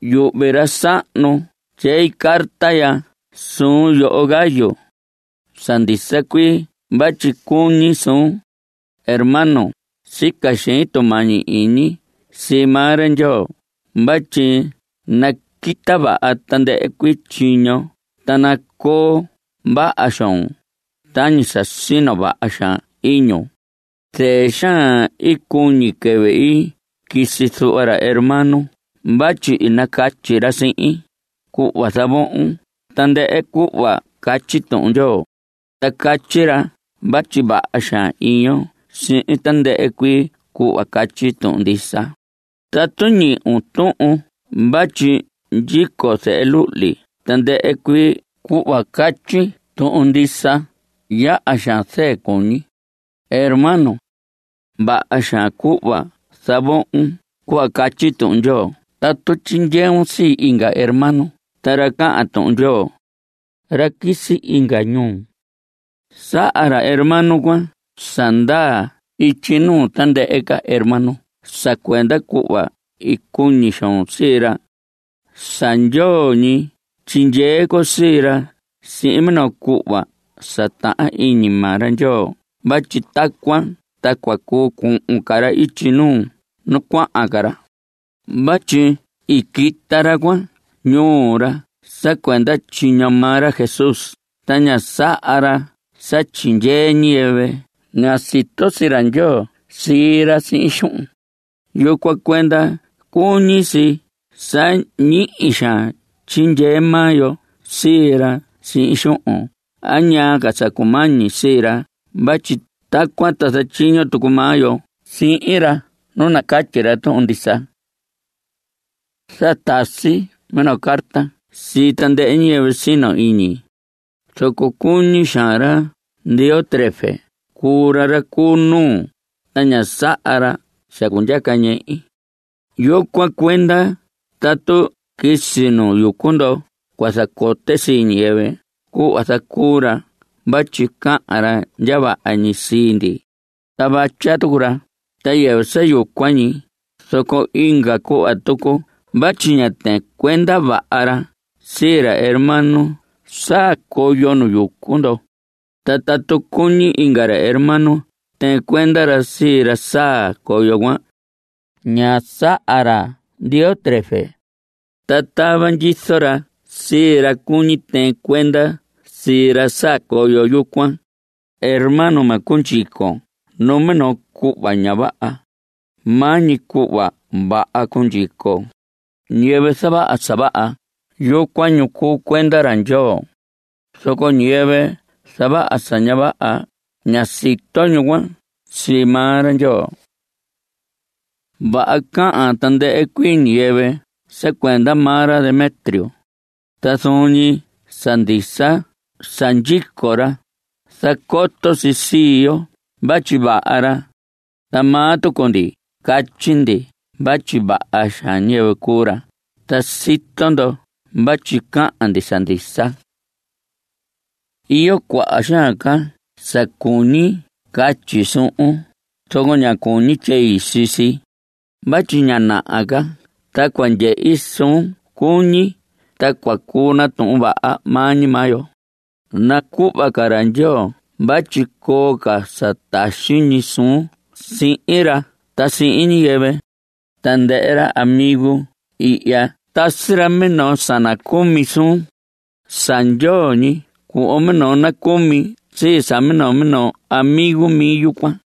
Yuhvi ra sahnu tyei carta ya suun, yoho Gayo. Sa ndisa cuii vatyi cuñi suun. Hermano, sica xein tumañi iñi sii maa ra Ndyoo vatyi naquita vaha tandɨhɨ cuii tyiñon ta nacoo vaha xoon tañi sa sino vaha xaan iñun. Zɨɨ xaan i cuñi quɨvɨ i quisi zuhva ra hermano vatyi i nacatyi ra sihin, cuhva zavohon tandɨhɨ cuhva catyi Tuhun Ndyoo. Ta catyi ra vatyi vaha xaan iyon sihin tandɨhɨ cuii cuhva catyi tuhun ndisa. Tatu ñihi tuhun vatyi ndyico zehe luhli tandɨhɨ cuii cuhva catyi tuhun ndisa, yaha xaan zɨɨ cuñi. Hermano, vaha xaan cuhva zavohon cuhva catyi Tuhun Ndyoo tatu tyindyeun sii inga hermano ta ra cahan Tuhun Ndyoo, ra quisi inga ñuu. Saha ra hermano cuan sa ndaa ityi nuu tandɨhɨ ca hermano sa cuenda cuhva i cuñi xoon sii ra. Sa ndyoo ñi tyindyee con sii ra sihin minoo cuhva sa tahan iñi maa ra Ndyoo vatyi tacuan ta cua cuu cuhun ca ra ityi nuu nu cuahan ra. Vatyi i quita ra cuan ñuu ra sa cuenda tyiño maa ra Jesús. Ta ña saha ra sa tyindyee ñiyɨvɨ ña sito sii ra Ndyoo sii ra sihin xuhun. Yucuan cuenda cuñi si sa ñihi xaan tyindyee maa yo sii ra sihin xuhun a ñaa sa cumañi sii ra vatyi tacuan ta zatyiño tucu maa yo sihin ra nu nacatyi ra tuhun ndisa. Sa tasi minoo carta sii tandɨhɨ ñiyɨvɨ sino iñi. Zoco cuñi xaan ra Diótrefes cuu ra ra cu nuu, ta ña saha ra sa cundyaca ñehi. Yucuan cuenda tatu quisi nu yucu ndo cua zacote sii ñiyɨvɨ cuhva zacuu ra vatyi cahan ra ndya vaha ñi sii ndi, ta vatya tucu ra. Ta yɨvɨ sa yucuan ñi, zoco inga cuhva tucu vatyi ña tɨɨn cuenda vaha ra sii ra hermano saa coyo nu yucu ndo. Ta tatu cuñi inga hermano tɨɨn cuenda ra sii ra saa coyo cuan, ña saha ra Diótrefes, ta tava ndyizo ra sii ra cuñi tɨɨn cuenda sii ra saa coyo yucuan. Hermano, ma cundyicon numinoo cuhva ña vaha. Maa ñi cuhva vaha cundyicon. Ñiyɨvɨ zavaha sa vaha, yucuan ñu cuu cuenda ra Ndyoo. Zoco ñiyɨvɨ zavaha sa ña vaha, ña sito ñu cuan sii maa ra Ndyoo. Vaha cahan tandɨhɨ cuii ñiyɨvɨ sa cuenda maa ra Demetrio. Ta zuun ñi sa ndisa sa ndyico ra, zacoto si sii yo vatyi vaha ra. Ta maa tucu ndi catyi ndi vatyi vaha xaan ñiyɨvɨ cuu ra, ta sito ndo vatyi cahan ndi sa ndisa. Iyo cuaha xaan ca sa cuñi catyi suhun, zoco ña cuñi tyei sii si. Vatyi ña naha ca ta cua ndyehi suun cuñi, ta cua cuu natuhun vaha maa ñi maa yo. Nacuhva ca ra Ndyoo vatyi coo ca sa taxi ñi suun sihin ra ta sihin ñiyɨvɨ. Tandɨhɨ ra amigun ihya tasi ra minoo sa nacumi suun. Sa ndyoo ñi cuhvon minoo nacumi sii sa minoo minoo amigo mi yucuan.